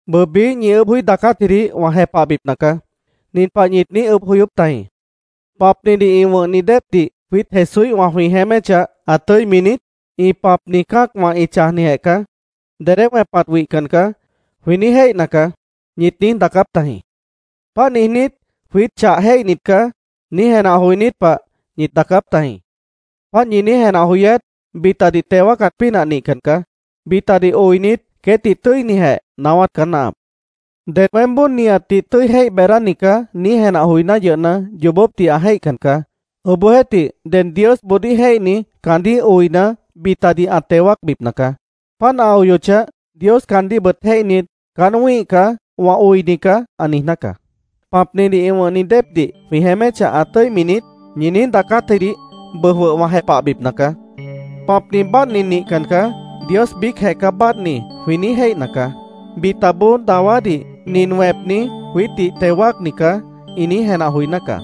Bʉʉ, biíh ñi ʉʉ́bh joí daacátjidih wã jepahbipna caá. Nin pah ñit niíj ʉʉ́bh joyóp tajĩ: “¿Pãpnidih ĩ wʉ̃hni déepdih jwiít Jesúíhwã jwĩ jeéméchah, ã tʉ́imi niít? ‘Ĩ pãpni cã́acwã ĩ chãjnijeh caá. Dedé wẽpat wihcan caá’, jwĩ niíj jéihna caá”, ñit niíj daacáp tajĩ. Páant niijnít, “Jwiít chah jéihnit caá”, niíj jenah joinít pah ñit daacáp tajĩ. Páant ñi niíj jenah joyát bitadih teo wáacat pínah nihcan caá. Bitadih oinit, queétdih tʉ́inijeh naáwát caá náahap. Ded “Weémboó nihatdih tʉ́i jéih beedáni caá”, niíj jenah joiná yʉhna, yoobópdih ã jéihcan caá. Obohjeéhtih, ded Diosboodíh jéihni, caandíh oina, bitadih ã teo wáacbipna caá. Páant ã oyochah, Dios caandíhbʉt jéihnit, “Caán wĩ́ih caá. Wã oini caá”, ã niijná caá. “¿Pãpnidih ĩ wʉ̃hni déepdih jwĩ jeéméchah, ã tʉ́imi niít?” ñi niíj daacátjidih bʉʉ jwʉh wã jepahbipna caá. “Pãpni báadhni nihcan caá. Dios biícjeh caá báadhni”, jwĩ niíj jéihna caá. Bitaboó dawádih “Nin wẽpni, jwiítdih teo wáacni caá”, ĩ niíj jenah joiná caá.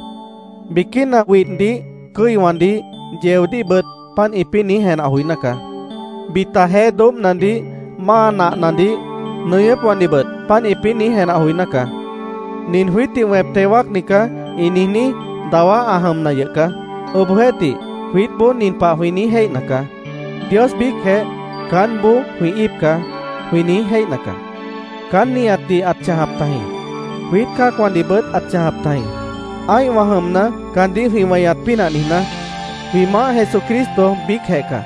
Biquína widhdih, cʉ́iwãdih, yeodíhbʉt páant ĩpĩ́ niíj jenah joiná caá. Bita jeé doóbhnadih, máa nahnadih, nʉñʉ́pwãdihbʉt páant ĩpĩ́ niíj jenah joiná caá. “Nin jwiítdih wẽp teo wáacni caá”, ĩ niijní, dawá ã jʉmna yʉh caá. Obohjeéhtih, jwiítboó nin pah jwĩ niíj jéihna caá: “Dios biícjeh, caánboó jwĩ íip caá”, jwĩ niíj jéihna caá. Caán nihatdih ãt chãjap tajĩ. Jwiít cã́acwãdihbʉt ãt chãjap tajĩ, ã́ihwã jʉmna, caandíh jwĩ weñat pínah niijná. Jwĩ Maáh Jesucristo biícjeh caá.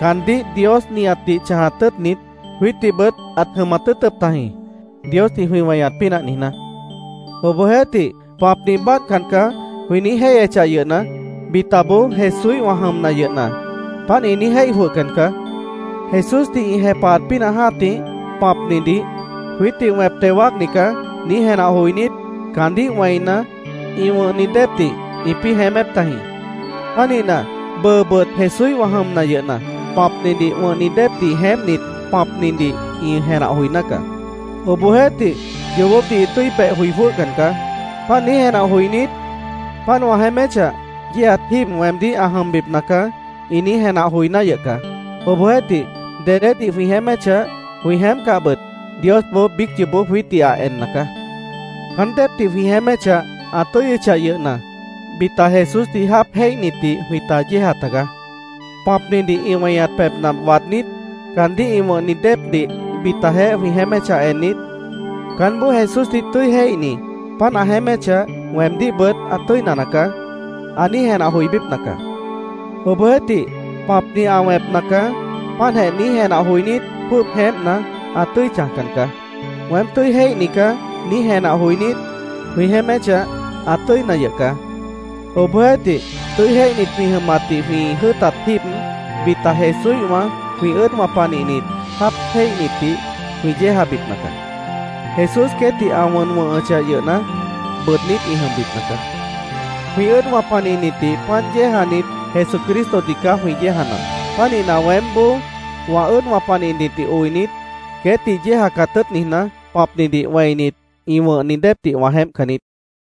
Caandíh Dios nihatdih chãjat tʉ́ʉtnit, jwiítdihbʉt ãt jʉmat tʉ́ʉtʉp tajĩ, Diosdih jwĩ weñat pínah niijná. Obohjeéhtih, “Pãpni báadhcan caá”, jwĩ niíj jéihyechah yʉhna, bitaboó, Jesúíhwã jʉmna yʉhna, páant ĩ niíj jéih jwʉhcan caá. Jesúsdih ĩ jepahat pínah jã́tih, pãpnidih “Jwiítdih wẽp teo wáacni caá”, niíj jenah joinít, caandíh wẽina, ĩ wʉ̃hni déepdih ĩpĩ́ jeémép tajĩ. Pánihna, bʉʉbʉt Jesúíhwã jʉmna yʉhna, pãpnidih wʉ̃hni déepdih jeémpnit, pãpnidih ĩ jenah joiná caá. Obohjeéhtih, yoobópdih ĩ tʉ́i beh joi jwʉ́hcan caá. Páant niíj jenah joinít, “Páant wã jeéméchah, yéejat jíib weemdíh ã jʉmbipna caá”, ĩ niíj jenah joiná yʉh caá. Obohjeéhtih dedédih jwĩ jeéméchah, jwĩ jeémpcahbʉt, Diosboó biíc yoobó jwiítdih ã enna caá. Caán déepdih jwĩ jeéméchah, ã tʉ́yʉchah yʉhna, bita Jesúsdih jáap jéihnitdih jwĩta yéeja tagaá. Pãpnidih ĩ weñat pebhna waadnít, caandíh ĩ wʉ̃hni déepdih bitajeéh jwĩ jeéméchah ennit, “Caánboó Jesúsdih tʉ́i jéihni páant ã jeéméchah, weemdíhbʉt ã tʉ́ina nacaá”, ã niíj jenah joibípna caá. Obohjeéhtih, “Pãpni ã wẽpna caá”, páantjeh niíj jenah joinít, jwʉ́ʉb jeémpna, ã tʉ́i chãjcan caá. “Weém tʉ́i jéihni caá”, niíj jenah joinít, jwĩ jeéméchah, ã tʉ́ina yʉh caá. Obohjeéhtih, tʉ́i jéihnit jwĩ jʉmatdih jwĩ jʉ́ʉtat jíib, bita Jesúíhwã jwĩ ʉ́ʉdwã panihnit, jáap jéihnitdih jwĩ yéejabipna caá. Jesús queétdih ã wʉn wʉ̃hʉchah yʉhna, bʉʉdnít ĩ jʉmbipna caá. Jwĩ ʉ́ʉdwã panihnitdih páant yéejanit, Jesucristodih caá jwĩ yéejanap. Pánihna, weémboó wã ʉ́ʉdwã panihnitdih oinit, queétdih yéejacat tʉ́ʉt niijná, pãpnidih wẽinit ĩ wʉ̃hni déepdih wã jeémpcan niít.